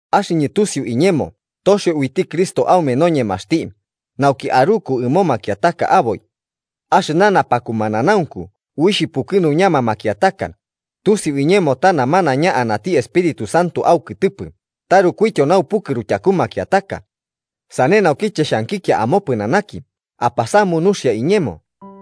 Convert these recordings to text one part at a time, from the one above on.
Axɨñɨ tusiu iñemo toxio uiti Cristo aume noñemaxti nauki aruku ɨmo makiataka aboi. Axɨna napakumananaunku uixh pukɨnuñama makiataka, tusiu iñemo ta namanaiña anati Espíritu Santo aukɨtɨpɨ tarukuityo naupukɨru tyaku makiataka. Sane naukiche xhankikia amopɨnanaki apasamu nuxia iñemo,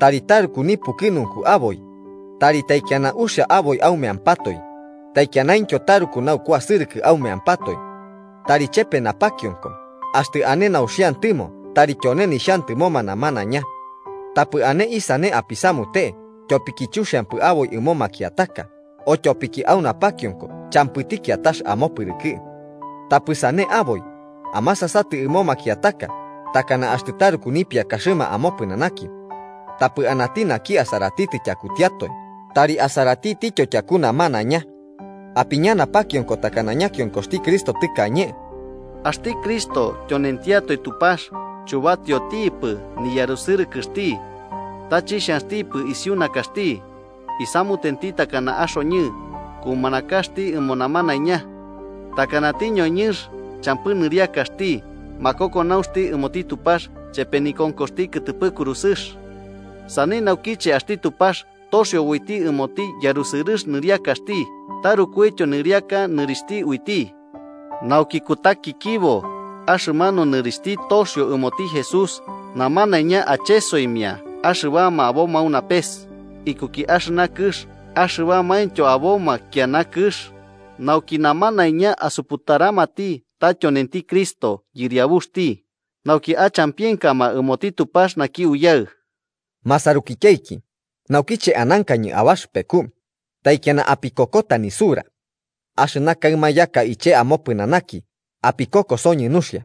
tari taruku nipukɨnunku aboi, tari taikiana uxia aboi aumeampatoe, taikianaintyo taruku naukuasɨrɨkɨ aumeampatoe. Tari chepe napakionko, axtɨ ane nauxiantɨmo tari tyone nixhantɨmoma namanaiña. Tapɨ ane isane apisamute tyopiki chuxiampɨ aboi ɨmo makiataka o tyopiki au napakionko champɨti kiatax amopɨrɨkɨ. Tapɨ sane aboi, amasasatɨ ɨmo makiataka takana axtɨ taruku nipiakaxɨma amopɨnanaki. Tapɨ anati naki asaratitɨ tyakutiatoe, tari asaratitityo tyaku namanaiña. Apiña napakionko takana ñakionkoxti Cristo tɨkañe: Axti Cristo tyonentiatoe Tupax, chubatiotipɨ niyarusɨrɨkɨxti. Ta chixhanxtipɨ isiu nakaxti, isamutenti takana axoñɨ, kumanakaxti ɨmo namanaiña. Takanati ñoñɨnx, champɨ nɨriakaxti makokonaunxti ɨmoti Tupax chepe nikonkoxti kɨtɨpɨ kurusɨx. Sane naukiche axti Tupax toxio uiti ɨmoti yarusɨrɨx nɨriakaxti tarukuityo nɨriaka nɨrixhti uiti, nauki kutakikibo axɨmanu nɨrixhti toxio ɨmoti Jesús, namanaiña achesoimia axɨbama aboma au napes, ikuki axɨna kɨx axɨbamaintyo aboma kiana kɨx, nauki namanaiña asuputaramati ta tyonenti Cristo Yɨriabuxti, nauki achampienkama ɨmoti Tupax naki Uyaɨ. Masarukityaiki, naukiche anankañɨ abaxɨpeku, taikiana apikokota nisura. Axɨna kaɨma yaka iche amopɨnanaki apikokosoñɨ nuxia.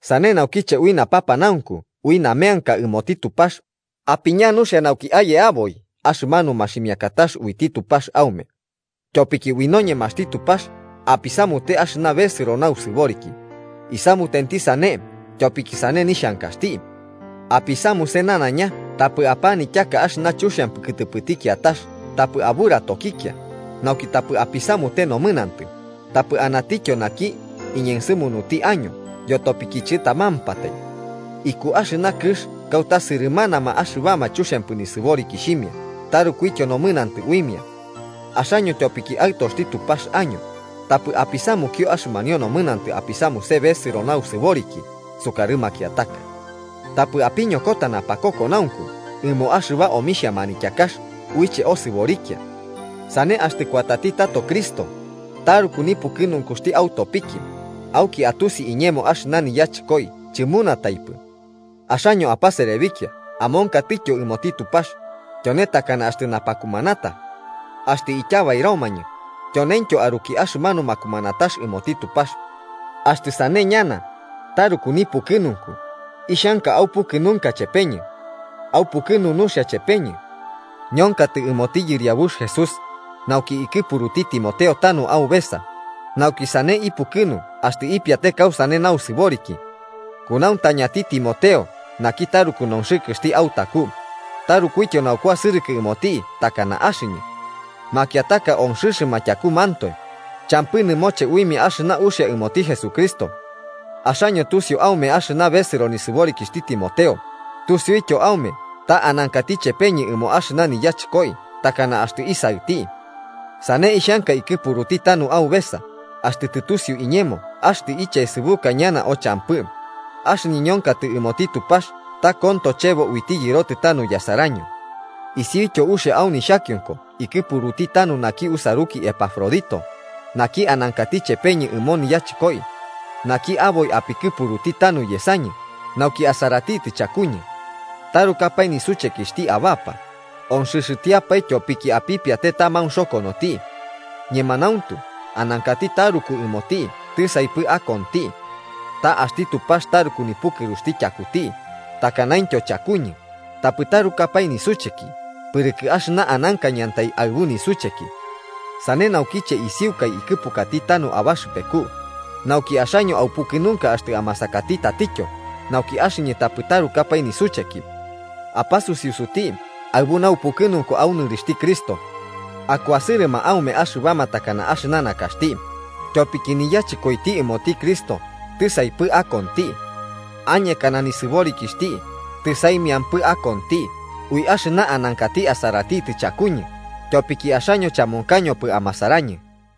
Sane naukiche ui napanaunku ui nameanka ɨmoti Tupax, apiña nuxia nauki aye aboi axɨmanu maximikatax uiti Tupax aume. Tyopiki ui noñemaxti Tupax apisamute axɨna besɨro nausɨboriki, isamutenti sane tyopiki sane nixhankaxti. Apisamuse nanaiña tapɨ apanityaka axɨna chuxiampɨ kɨtɨpɨti kiatax tapɨ aburatokikia, nauki tapɨ apisamute nomɨnantɨ tapɨ anatityo naki iñensɨmunuti año yotopiki chɨtamampatai. Iku axɨna kɨx kauta sɨrɨmanama axɨbama chuxiampɨ nisɨborikixhimia tarukuityo nomɨnantɨ uimia. Axaño tyopiki aɨtoxti Tupax año, tapɨ apisamukio axɨmanio nomɨnantɨ apisamuse besɨro nausɨboriki sukarɨ makiataka. Tapɨ apiñokota napakokonaunku ɨmo axɨba omixhia manityakax uiche osɨborikia. Sane, axtɨ kuatati tato Cristo taruku nipukɨnunku autopiki, auki atusi iñemo axɨna niyachɨkoi chɨmunataipɨ. Axaño apaserebikia amonkatɨtyo ɨmoti Tupax, tyone takana axtɨ napakumanata. Axtɨ ityabairomañɨ, tyoneintyo aruki axɨmanu makumanatax ɨmoti Tupax. Axtɨ sane ñana, taruku nipukɨnunku, ixhanka aupukɨnunka chepeñɨ. Aupukɨnute nuxia chepeñɨ. Ñonkatɨ ɨmoti Yɨriabux Jesús, nauki ikɨpuruti Timoteo tanu aubesa, nauki sane ipukɨnu axtɨ ipiate kausane nausɨboriki. Kunauntañati Timoteo naki taruku nonxɨkɨxti autaku, tarukuityo naukuasɨrɨkɨ ɨmoti takana axɨñɨ. Makiataka onxɨxɨma tyakumantoe, champɨ nɨmoche uimia axɨna uxia ɨmoti Jesucristo. Axaño tusiu aume axɨna besɨro nisɨborikixhti Timoteo tusiuityo aume ta anankati chepeñɨ ɨmo axɨna niyachɨkoi takana axtɨ isaɨti. Sane ixhanka ikɨpuruti tanu aubesa, axtɨ tɨtusiu iñemo axtɨ ichaesɨbuka ñana o champɨ, axɨñɨ ñonkatɨ ɨmoti Tupax ta konto chebo uiti yɨrotɨ tanu yasaraño. Isiuityo uxia au nixhakionko ikɨpuruti tanu naki usaruki Epafrodito, naki anankati chepeñɨ ɨmo niyachɨkoi, naki aboi apikɨpuruti tauna yesañɨ nauki asaratitɨ chakuñɨ. Tarukapae nisuchekixhti abapa, onxɨxɨtiapae tyopiki apipiate ta maunxokonoti. Ñemanauntu, anankati taruku ɨmoti tisaipɨ akonti. Ta axti Tupax taruku nipukɨruxti tyakuti, takanaintyo chakuñɨ, tapɨ tarukapae nisucheki pɨrɨkɨ axɨna anankañɨantai aɨbu nisucheki. Sane naukiche isiukai ikɨpukati tanu abaxɨpeku, nauki axaño aupukɨnunka axtɨ amasakati tatityo nauki axɨñɨ tapɨ tarukapae nisucheki. Apasusiusuti aɨbu naupukɨnunku au nɨrixhti Cristo. Akuasɨrɨma aume axɨbama takana axɨna nakaxti, tyopiki niyachɨkoiti ɨmoti Cristo tisaipɨ akonti. Añekana nisɨborikixhti, tɨsaimiampɨ akonti, ui axɨna anankati asaratitɨ chakuñɨ tyopiki axaño chamonkañopɨ amasarañɨ.